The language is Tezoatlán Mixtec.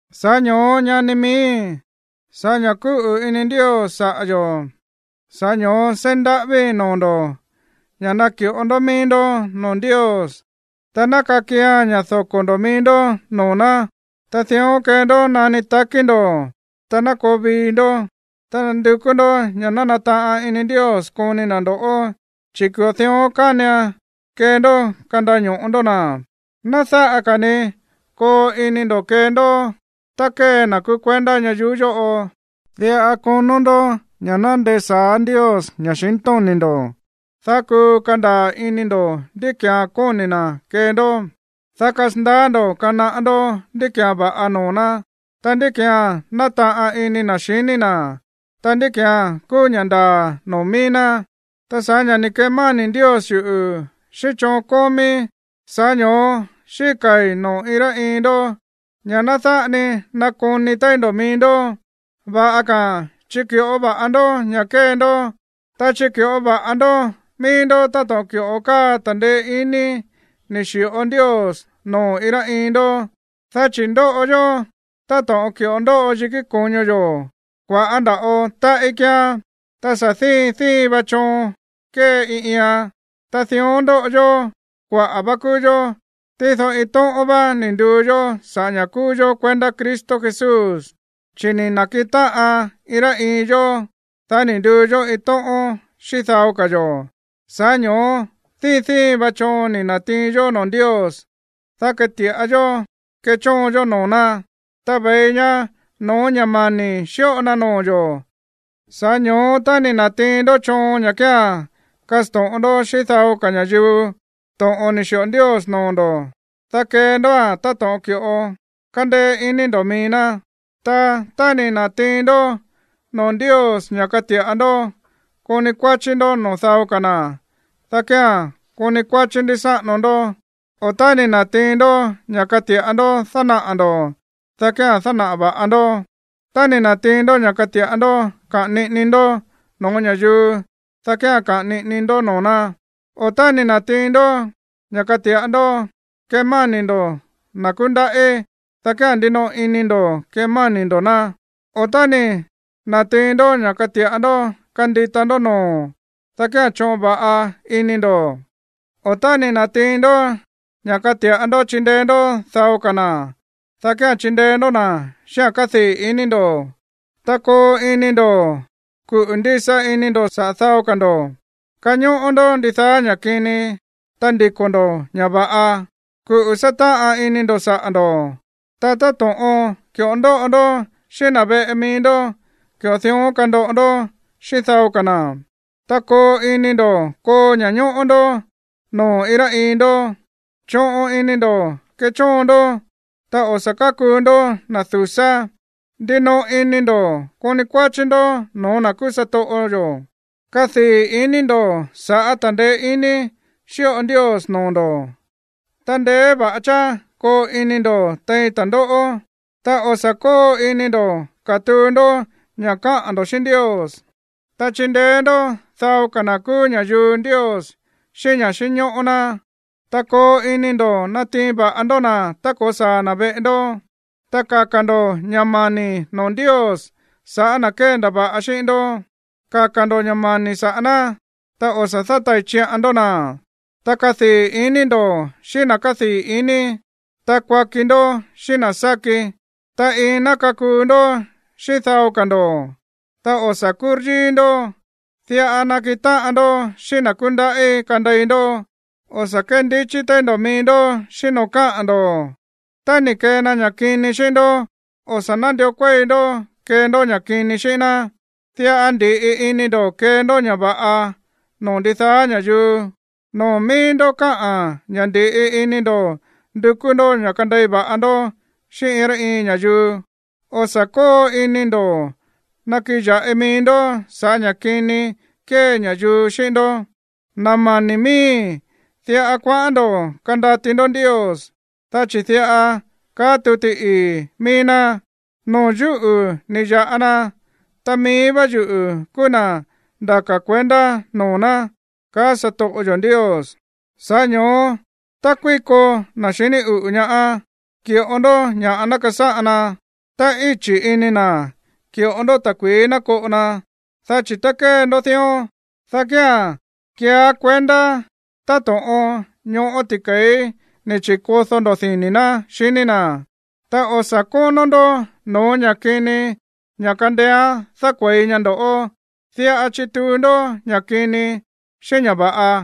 Sa̱ꞌá ño̱ó, ñani miíi̱, sa̱ꞌá ña̱ kúꞌu̱ ini Ndios saꞌa̱ yo̱, sa̱ꞌá ño̱ó seí ndaꞌávíi̱ noo̱ ndo̱ ña̱ naki̱ꞌo ndó mií ndó noo̱ Ndios, ta ná kakian ña̱ doko̱ ndo̱ mií ndó noo̱ ná, ta dión kee ndó nani takí ndo̱, ta ná koo vii ndo̱, ta ná ndukú ndó ña̱ nataꞌan ini Ndios koni na̱ ndo̱ꞌó, chi̱ ki̱ꞌo dión kánian kee ndó kandaño̱ꞌo ndó na̱. Ná dáꞌa ka̱ ni koo ini ndo̱ kee ndó tá kée na̱ kúú kuendá ñayuú yóꞌo. Diꞌa konó ndó ña̱ ná ndesa̱á Ndios ña̱xintóni̱ ndo̱, dá kuu kandaa̱ ini ndo̱ ndí ki̱án kóni̱ na̱ kee ndó, dá kasandaá ndo̱ kanaꞌá ndó ndí ki̱án va̱ꞌa noo̱ ná, ta ndí ki̱án nátaꞌan ini na̱ xiní na̱, ta ndí ki̱án kúú ña̱ ndaa̱ noo̱ mií ná. Ta sa̱ꞌá ña̱ ni̱ kemáni̱ Ndios yuꞌu̱ xíꞌín choon kómíí, sa̱ꞌá ño̱ó xíka̱i̱ noo̱ iin rá iin ndó ña̱ ná dáꞌa ni nakoni téí ndo̱ mií ndó. Va̱ꞌa ka̱a̱n chiki̱ꞌó va̱ꞌa ndó ña̱ kée ndó. Ta chiki̱ꞌó va̱ꞌa ndó mií ndó táto̱ꞌon ki̱ꞌo káa ta̱ndeé iní ni̱ xi̱ꞌo Ndios noo̱ iin rá iin ndó. Dá chi̱ ndóꞌo yó táto̱ꞌon ki̱ꞌo ndóꞌo yikí ko̱ño yo̱, kua̱ꞌá nda̱ꞌo táꞌí kíán, ta sa̱ díin díin va choon kée iin iian. Ta dión ndóꞌo yó. Kuaꞌa̱ vá kúú yó, tído iin tóꞌón vá ni̱ nduu yó sa̱ꞌá ña̱ kúú yó kuendá Cristo Jesús. Chi̱ ni̱ na̱kiꞌin táꞌan iin rá iin yó, dá ni̱ nduu yó iin tóꞌón xíꞌín dao ka̱ yo̱. Sa̱ꞌá ño̱ó díin díin va choon ni̱ na̱tiin yó noo̱ Ndios, dá kati̱ꞌa yó kechóon yó noo̱ ná, ta ve̱i ña no̱ó ña̱ mani̱ xíꞌo na noo̱ yo̱. Sa̱ꞌá ño̱ó tá ni̱ na̱tiin ndó choon ña̱ kía̱n kasto̱ꞌon ndó xíꞌín dao ka̱ ña̱yuu to̱ꞌon ni̱ xi̱ꞌo Ndios noo̱ ndo̱, dá kee ndóa̱n táto̱ꞌon ki̱ꞌo kándéé iní ndo̱ mií ná. Ta tá ni̱ na̱tiin ndó noo̱ Ndios ña̱ kati̱ꞌa ndó koni kuáchí ndó noo̱ dao ka̱ na̱, dá kía̱n koni kuáchí ndísáꞌano ndó, o tá ni̱ na̱tiin ndó ña̱ kati̱ꞌa ndó dánaꞌa̱ ndo̱, dá kía̱n dánaꞌa̱ va̱ꞌa ndó. Tá ni̱ na̱tiin ndó ña̱ kati̱ꞌa ndó kaꞌa̱n niꞌini ndó no̱ó ña̱yuu, dá kía̱n kaꞌa̱n niꞌini ndó noo̱ ná, o tá ni̱ na̱tiin ndó ña̱ kati̱ꞌa ndó kemáni̱ ndo̱ na̱ kúndaꞌí, dá kía̱n ndinoꞌo ini ndo̱ kemáni̱ ndo̱ ná, o tá ni̱ na̱tiin ndó ña̱ kati̱ꞌa ndó kandita ndó noo̱, dá kía̱n choꞌon va̱ꞌa ini ndo̱, o tá ni̱ na̱tiin ndó ña̱ kati̱ꞌa ndó chindeé ndó dao ka̱ na̱, dá kía̱n chindeé ndó na̱ xíꞌa̱n kádii̱ iní ndo̱. Ta koo ini ndo̱ kuꞌu̱ ndisa ini ndo̱ saꞌa̱ dao ka̱ ndo̱. Kañóꞌó ndó ndidaá ña̱ kini, ta ndiko̱ ndo̱ ña̱ va̱ꞌa. Kuꞌu̱ sátáꞌan ini ndo̱ saꞌa̱ ndo̱. Ta táto̱ꞌon ki̱ꞌo ndóꞌo ndó xíꞌín na̱ veꞌe mií ndó, ki̱ꞌo dión kandoꞌo ndó xíꞌín dao ka̱ na̱. Ta koo ini ndo̱ koo ña̱ñóꞌó ndó noo̱ iin rá iin ndó. Choꞌon ini ndo̱ kechóon ndó, ta o̱ sa̱ kákuu ndó na̱ du̱sá. Ndinoꞌo ini ndo̱ koni kuáchí ndó no̱ó na̱ kúú satoꞌo yo̱. Kadii̱ ini ndo̱ sa̱ꞌá ta̱ndeé iní xíꞌo Ndios noo̱ ndo̱, ta ndeé va̱ꞌa cháá koo ini ndo̱ tein ta̱ndóꞌó, ta o̱ sa̱ kóo ini ndo̱ katuu ndó ña̱ káꞌa̱n ndo̱ xíꞌín Ndios. Ta chindeé ndó dao ka̱ na̱ kúú ña̱yuu Ndios xíꞌín ña̱ xínñóꞌó ná, ta koo ini ndo̱ natiin va̱ꞌa ndó na̱ tá ko̱saa̱ na̱ veꞌe ndó. Ta kaka̱ ndo̱ ña̱ mani̱ noo̱ Ndios sa̱ꞌá na̱ kéndava̱ꞌa xíꞌín ndó, kaka̱ ndo̱ ña̱ mani̱ saꞌa̱ ná, ta o̱ sa̱ dátai̱ chiꞌan ndó na̱. Ta kadii̱ iní ndo̱ xíꞌín na̱ kádii̱ iní, ta kuaki ndó xíꞌín na̱ sáki. Ta iin ná kakuu ndó xíꞌín dao ka̱ ndo̱. Ta o̱ sa̱ kúryíí ndó, diꞌa nakiꞌin táꞌan ndó xíꞌín na̱ kúndaꞌí kandei ndó. O̱ sa̱ kéndichí téí ndo̱ mií ndó xíꞌín noo̱ káꞌa̱n ndo̱. Tá ni̱ kee na ña̱ kini xíꞌín ndó, o̱ sa̱ nándió kuéi ndó kee ndó ña̱ kini xíꞌín ná. Diꞌa ndi̱ꞌi ini ndo̱ kee ndó ña̱ va̱ꞌa noo̱ ndidaá ña̱yuu. Noo̱ mií ndó káꞌa̱n ña̱ ndi̱ꞌi ini ndo̱ ndukú ndó ña̱ kandei va̱ꞌa ndó xíꞌín iin rá iin ña̱yuu. O̱ sa̱ kóo ini ndo̱ nakiꞌin ya̱ꞌi mií ndó sa̱ꞌá ña̱ kini kée ña̱yuu xíꞌín ndó, na̱ mani̱ miíi̱. Diꞌa kuaꞌán ndo̱ kandati ndó Ndios, dá chi̱ diꞌa kaá tuti ii̱ mií ná: “Noo̱ yúꞌu̱ ni̱ ya̱ꞌa na, ta mií vá yuꞌu̱ kúú na̱ ndaka̱ kuendá noo̱ ná, kaá satoꞌo yo̱ Ndios.” Sa̱ꞌá ño̱ó, tá kuíko na̱ xiní uꞌu̱ ñaá, ki̱ꞌo ndó ña̱ꞌa ná kasáꞌan na. Tá íchi̱ ini na̱, ki̱ꞌo ndó ta̱kui̱í ná koꞌo na, dá chi̱ tá kée ndó dión, dá kía̱n keeá kuendá táto̱ꞌon ñoꞌó ti̱ke̱í ni̱ chi̱kodó ndo̱ dini̱ ná xiní na̱. Ta o̱ sa̱ kónó ndó no̱ó ña̱ kini ña̱ kandeéán dákue̱i ñaá ndo̱ꞌó, diꞌa chituu ndó ña̱ kini xíꞌín ña̱ va̱ꞌa.